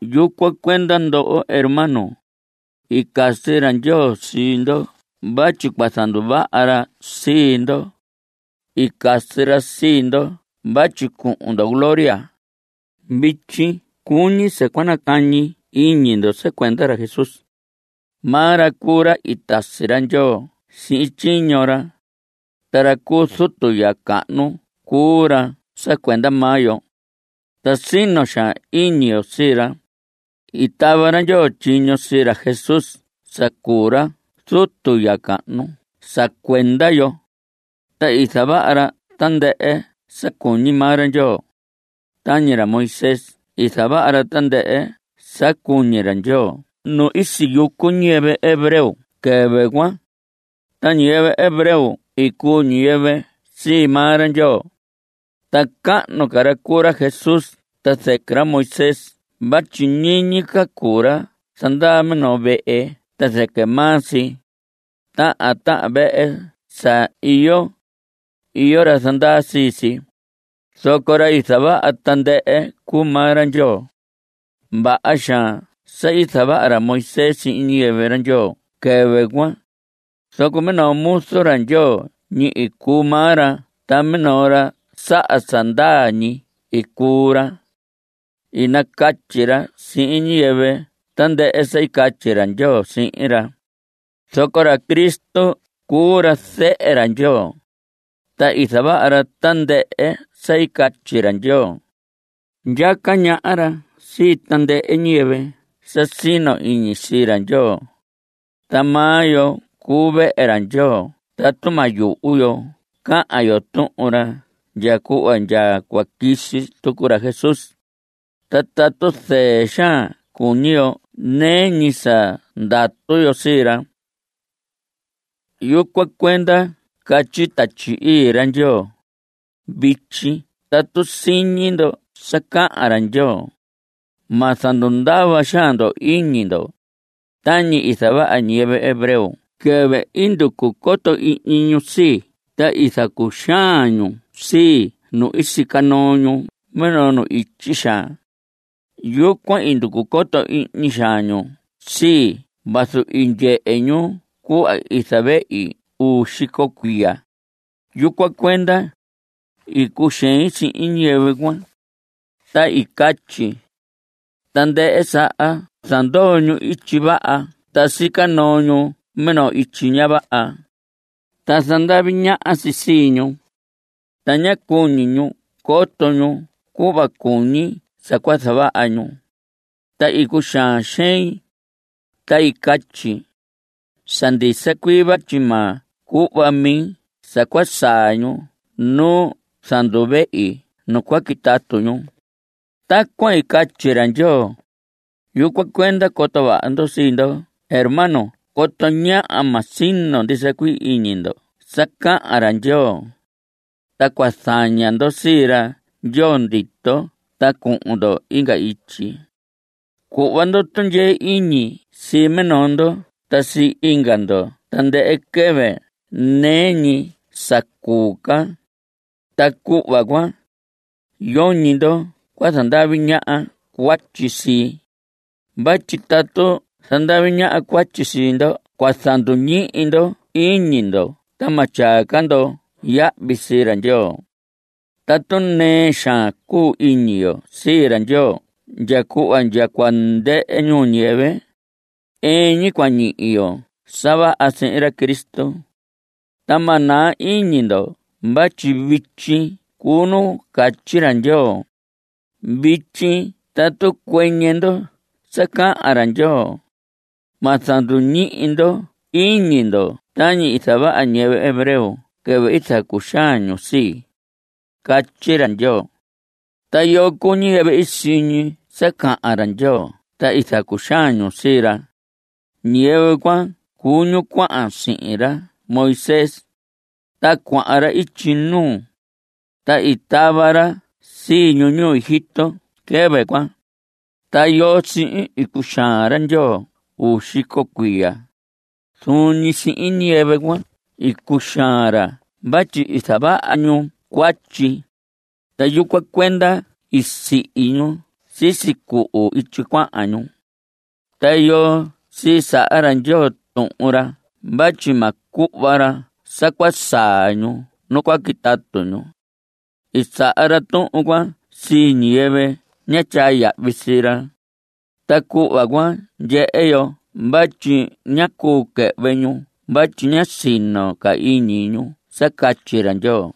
Yucuan cuenda, ndoho hermanos, i casi ra Ndyoo sii ndo vatyi cua zanduvaha ra sii ndo. I casi ra sii ndo vatyi cuhun ndo gloria. Vityi cuñi sa cua nacañi iñi ndo sa cuenda ra Jesús. Maa ra cuu ra i tasi ra Ndyoo sihin tyiño ra. Ta ra cu zutu ya cahnu cuu ra sa cuenda maa yo, ta sino xaan iñi yo sii ra. I tava ra Ndyoo tyiño sii ra Jesús sa cuu ra zutu ya cahnu sa cuenda yo, ta i zavaha ra tandɨhɨ sa cuñi maa ra Ndyoo. Tañi ra Moisés i zavaha ra tandɨhɨ sa cuñi ra Ndyoo nu i siyucu ñiyɨvɨ hebreo quɨvɨ cuan. Ta ñiyɨvɨ hebreo i cuu ñiyɨvɨ sii maa ra Ndyoo. Ta cahnu ca ra cuu ra Jesús ta zɨquɨ ra Moisés vatyi ñiñi ca cuu ra zandaa minoo vehe ta zɨquɨ maa si. Tahan tahan vehe sa iyo, iyo ra zandaa sii si, zoco ra i zavaha tandɨhɨ cuu maa ra Ndyoo. Vaha xaan sa i zavaha ra Moisés sihin ñiyɨvɨ ra Ndyoo quɨvɨ cuan, zoco minoo muzu ra Ndyoo ñi i cuu maa ra ta minoo ra saha sa ndaa ñi i cuu ra. I nacatyi ra sihin ñiyɨvɨ tandɨhɨ sa i catyi ra Ndyoo sihin ra. Zoco ra Cristo cuu ra zehe ra Ndyoo, ta i zavaha ra tandɨhɨ sa i catyi ra Ndyoo. Ndyaca ñaha ra sii tandɨhɨ ñiyɨvɨ sa sino iñi sii ra Ndyoo. Ta maa yo cuu vehe ra Ndyoo tatu ma yuhu yo cahan yo tuhun ra ndya cuhva ndya cua quisi tucu ra Jesús. Ta tatu zɨɨ xaan cuñi yo nɨɨ ñi sa ndatu yo sii ra. Yucuan cuenda catyi Tatyi Ii ra Ndyoo: Vityi tatu siñi ndo sa cahan ra Ndyoo, Ma zandundava xaan ndo iñi ndo, Tañi i zavaha ñiyɨvɨ hebreo quɨvɨ i nducu coto ihñi ñu sii ta i zacuxaan xaan ñu sii nu i sica noo ñu minoo nu ityi xaan. Yucuan i nducu coto ihñi xaan ñu sii vazu i ndyehe ñu cuhva i zavehi uu xico cuiya. Yucuan cuenda i cuxein sihin ñiyɨvɨ cuan, Ta i catyi: “Tandɨhɨ saha zandoo ñu ityi vaha ta sica noo ñu minoo ityi ña vaha, ta zandavi ñaha si sii ñu, Ta ña cuñi ñu coto ñu cuhva cuñi sa cua zavaha ñu.” Ta i cuxaan xein, ta i catyi: “Sa ndisa cuii vatyi ma cuhva mi sa cua saa ñu nu i zanduvehi nu cua quitatu ñu.” Tacuan i catyi ra Ndyoo. Yucuan cuenda coto vaha ndo sii ndo hermano coto ñáha ma sino ndisa cuii iñi ndo sa cahan ra Ndyoo, ta cua zaña ndo sii ra Ndyoo ndito ta cuhun ndo inga ityi. Cuhva ndo tundyee iñi sii minoo ndo ta sii inga ndo tandɨhɨ quɨvɨ nɨɨ ñi sa cuu ca, ta cuhva cuan, yoñi ndo cua zandavi ñaha cuatyi sii. Vatyi tatu zandavi ñaha cuatyi sii ndo cua zanduñihi ndo iñi ndo ta ma tyaa ca ndo yahvi sii ra Ndyoo. Tatu nɨɨ xaan cuu iñi yo sii ra Ndyoo ndya cuhva ndya cua ndɨhɨ ñuu ñiyɨvɨ, ɨɨn ñi cua ñihi yo sa vaha sihin ra Cristo. Ta ma naa iñi ndo vatyi vityi cuu nu catyi ra Ndyoo: Vityi tatu cuɨñɨ ndo sa cahan ra Ndyoo, Ma zanduñihi ndo iñi ndo tañi i zavaha ñiyɨvɨ hebreo quɨvɨ i zacuxaan ñu sii. Catyi ra Ndyoo. ¿Ta yoo cuu ñiyɨvɨ i siñi sa cahan ra Ndyoo ta i zacuxaan ñu sii ra? Ñiyɨvɨ cuan cuu ñu cuahan sihin ra Moisés. Ta cuahan ra ityi nuu, ta i tava ra sii ñu ñuu Egipto quɨvɨ cuan. ¿Ta yoo sihin i cuxaan ra Ndyoo uu xico cuiya? Zuun ñi sihin ñiyɨvɨ cuan i cuxaan ra vatyi i zavaha ñu cuatyi, ta yucuan cuenda i sihi ñu sisi cuhu ityi cuahan ñu. ¿Ta yoo sii saha ra Ndyoo tuhun ra vatyi ma cuhva ra sa cua saa ñu nu cua quitatu ñu? I saha ra tuhun cuan sii ñiyɨvɨ ñá tyaa yahvi sii ra. Ta cuhva cuan ndyehe yo vatyi ñá cuu quɨhvɨ ñu vatyi ñá sino ca iñi ñu sa catyi ra Ndyoo.